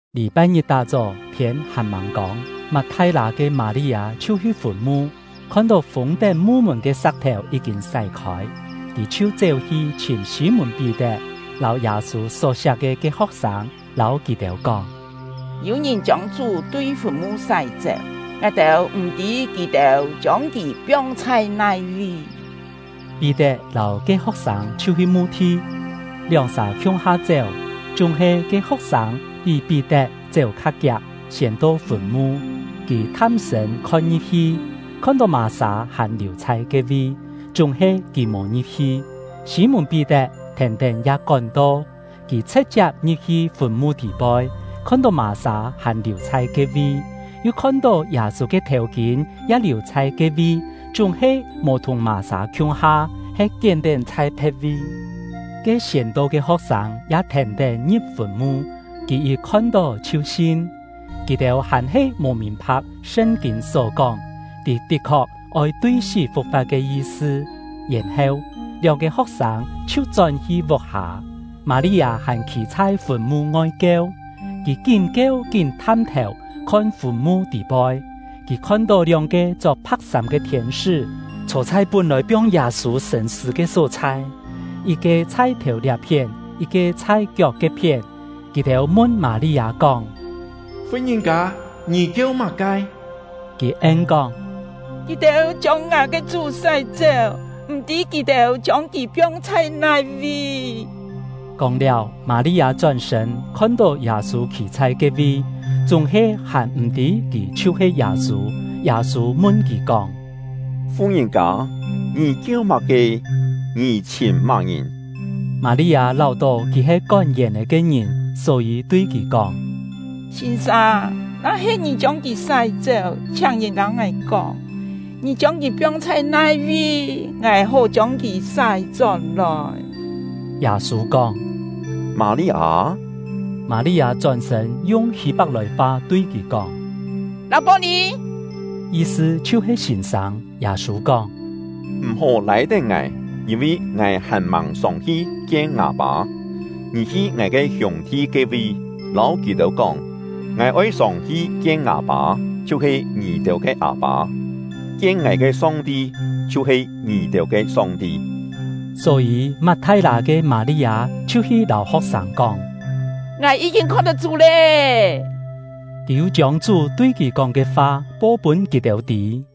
Lî-pai-ngit tá-chó, thiên hàn-màng kông, Mat-thai-lâ ke Mâ-li-â chhiu hi fùn-mu, khon-tó fûng-tén mu-mùn ke sa̍k-thèu yí-kîn sái-khôi. Kì chhiu chéu-hi chhìm Sî-mùn-Pí-tet lâu Yâ-sû só-siak ke ke ho̍k-sâng, lâu kì-têu kóng: “Yû ngìn chiông Chú tui fùn-mu sái-chéu, ngài-têu m̀-tî kì-têu chiông kì piong chhai nai-vi!” Pí-tet lâu ke ho̍k-sâng chhiu hi mu-thi. Lióng-sà khiung-ha chéu, chúng-he ke ho̍k-sâng pí Pí-tet chéu kha kiak, siên to fùn-mu. Kì tham-sṳ̂n khon-ngi̍p-hi, khon-tó mà-sâ hàn liù chhai ke-vi, chúng-he kì mò ngi̍p-hi. Sî-mùn-Pí-tet thèn-tén ya kón-to; kì chhṳ̍t-chiap ngi̍p-hi fùn-mu tî-poi, khon-tó mà-sâ hàn liù chhai ke-vi, yu khon-tó Yâ-sû ke thèu-kîn ya liù chhai ke-vi, chúng-he mò thùng mà-sâ khiung-ha, he kién-tén chhai phe̍t-vi. Ke siên to ke ho̍k-sâng ya thèn-tén ngi̍p fùn-mu; kì yit khon-tó chhiu sin. (Kì-têu hàn-he mò mìn-pha̍k Sṳn-kîn só kóng, kì tit-khok oi tui sí fu̍k-fa̍t ke yi-sṳ.) Yèn-heu, lióng-ke ho̍k-sâng chhiu chón-hi vuk-hâ. Mâ-li-â hàn khî chhai fùn-mu-ngoi kieu. Kì kín kieu kín tham-thèu khon fùn-mu tî-poi. Kì khon-tó lióng-ke chok pha̍k sâm ke thiên-sṳ́, chhô chhai pún-lòi piong Yâ-sû sṳ̂n-sṳ̂ ke só-chhai, yit-ke chhai thèu liá-phién, yit-ke chhai kiok ke-phién. Kì-têu mun Mâ-li-â kóng: “Fu-ngìn-kâ, ngì kieu má-ke?” Kì en-kóng: “Kì-têu chiông ngài ke Chú sái-chéu, m̀-tî kì-têu chiông kì piong chhai nai-vi!” Kóng-liáu, Mâ-li-â chón-sṳ̂n, khon-tó Yâ-sû khî chhai ke-vi, chúng-he hàn m̀ tî kì chhiu-he Yâ-sû. Yâ-sû mun kì kóng: “Fu-ngìn-kâ, ngì kieu má-ke? Ngì chhìm má-ngìn?” Mâ-li-â láu-tó kì he kón yèn-è ke ngìn, só-yî tui kì kóng: “Sîn-sâng, na-he ngì chiông kì sái-chéu, chhiáng lâu ngài kóng, ngì chiông kì piong chhai nai-vi, ngài hó chiông kì sái-chón-lòi.” Yâ-sû kóng: “Mâ-li-â!” Mâ-li-â chón-sṳ̂n, yung Hî-pak-lòi-fa tui kì kóng: “Lâ-pô-nì!” (Yi-sṳ chhiu-he “Sîn-sâng”.) Yâ-sû kóng: “M̀-hó lâi-tén ngài, yîn-vi ngài hàn-màng sông-hi kien ngâ Pâ. Ngì hi ngài ke hiûng-thi ke-vi, lâu kì-têu kóng: ‘Ngài oi sông-hi kien ngâ Pâ, chhiu-he ngì-têu ke Â-pâ, kien ngài ke Song-ti, chhiu-he ngì-têu ke Song-ti.’” Só-yî, Mat-thai-lâ ke Mâ-li-â chhiu hi lâu ho̍k-sâng kóng: “Ngài yí-kîn khon-tó Chú lé!” Kì yu chiông Chú tui kì kóng ke fa po-pûn kì-têu tî.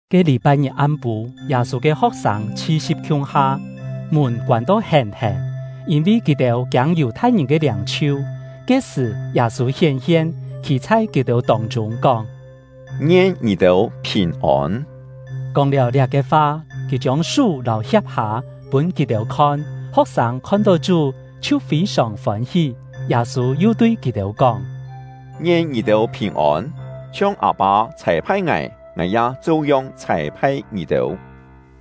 Ke lî-pai-ngit am-pû, Yâ-sû ke ho̍k-sâng chhi-si̍p khiung-ha, mùn koân-to hèn-hèn, yîn-vi kì-têu kiâng Yù-thai-ngìn ke liâng-chhiu. Ke-sṳ̀, Yâ-sû hién-hien, khî chhai kì-têu tông-chûng, kóng: “Ngien ngì-têu phìn-ôn!” Kóng-liáu liá-ke fa, kì chiông sú lâu hia̍p-hâ pûn kì-têu khon. Ho̍k-sâng khon-tó Chú, chhiu fî-sòng fôn-hí. Yâ-sû yu tui kì-têu kóng: “Ngien ngì-têu phìn-ôn! Chhiong Â-pâ chhâi-phai ngài, ngài ya cheu-yong chhâi-phai ngì-têu.”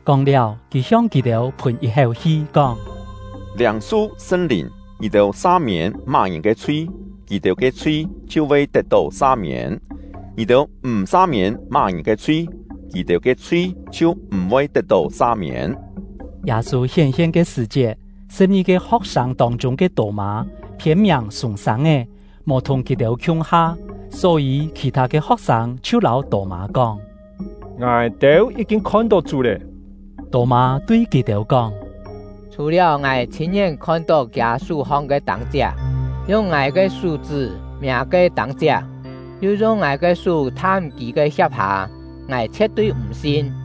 Kóng-liáu, kì hiong kì-têu phùn yit-héu hi, kóng: “Liâng-su Sṳn-Lìn! Ngì-têu sa-miên má-ngìn ke chhui, kì-têu ke chhui chhiu voi tet-tó sa-miên; ngì-têu m̀ sa-miên má-ngìn ke chhui, kì-têu ke chhui chhiu m̀-voi tet-tó sa-miên.” Yâ-sû hién-hien ke sṳ̀-chiet, sṳ̍p-ngi-ke ho̍k-sâng tông-chûng ke Tô-mâ (phiên-miàng Sûng-sâng-é) mò thùng kì-têu khiung-ha. Só-yî khì-thâ ke ho̍k-sâng chhiu lâu Tô-mâ kóng: “Ngài-têu yí-kîn khon-tó Chú lé!” Tô-mâ tui kì-têu kóng: “Chhù-liáu ngài chhîn-ngién khon-tó kiâ sú-hong ke tâng-chiak, yung ngài ke sú-chṳ́ miâ ke tâng-chiak, yu yung ngài ke sú tham kì ke hia̍p-hâ, ngài chhie̍t-tui m̀ sin.”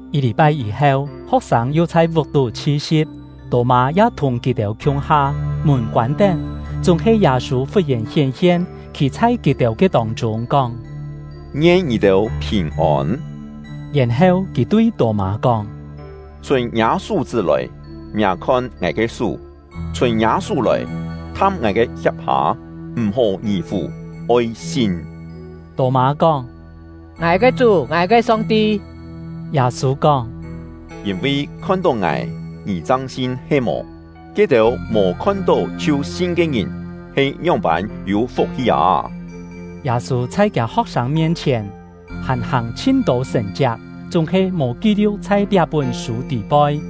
Yit lî-pai yî-heu, ho̍k-sâng yu chhai vuk-tú chhi-si̍p; Tô-mâ ya thùng kì-têu khiung-ha. Mùn koân-tén, chúng-he Yâ-sû fut-yèn hién-hien, khî chhai kì-têu ke tông-chûng, kóng: “Ngien ngì-têu phìn-ôn!” Yèn-heu kì tui Tô-mâ kóng: “Chhûn ngiâ sú-chṳ́ lòi, miâ khon ngài ke sú; chhûn ngiâ sú lòi, tham ngài ke hia̍p-hâ. M̀-hó ngì-fù, oi sin!” Tô-mâ kóng: “Ngài ke Chú, ngài ke Song-ti!” Yâ-sû kóng: “Yîn-vi khon-tó ngài, ngì chang sin he-mò? Ke-têu mò khon-tó chhiu sin ke ngìn he ngióng-pân yû fuk-hi â!” Yâ-sû chhai kiâ ho̍k-sâng mien-chhièn hàn hàng chhin-tô sṳ̀n-chiak, chúng-he mò ki-liu̍k chhai liá-pún sû tî-poi.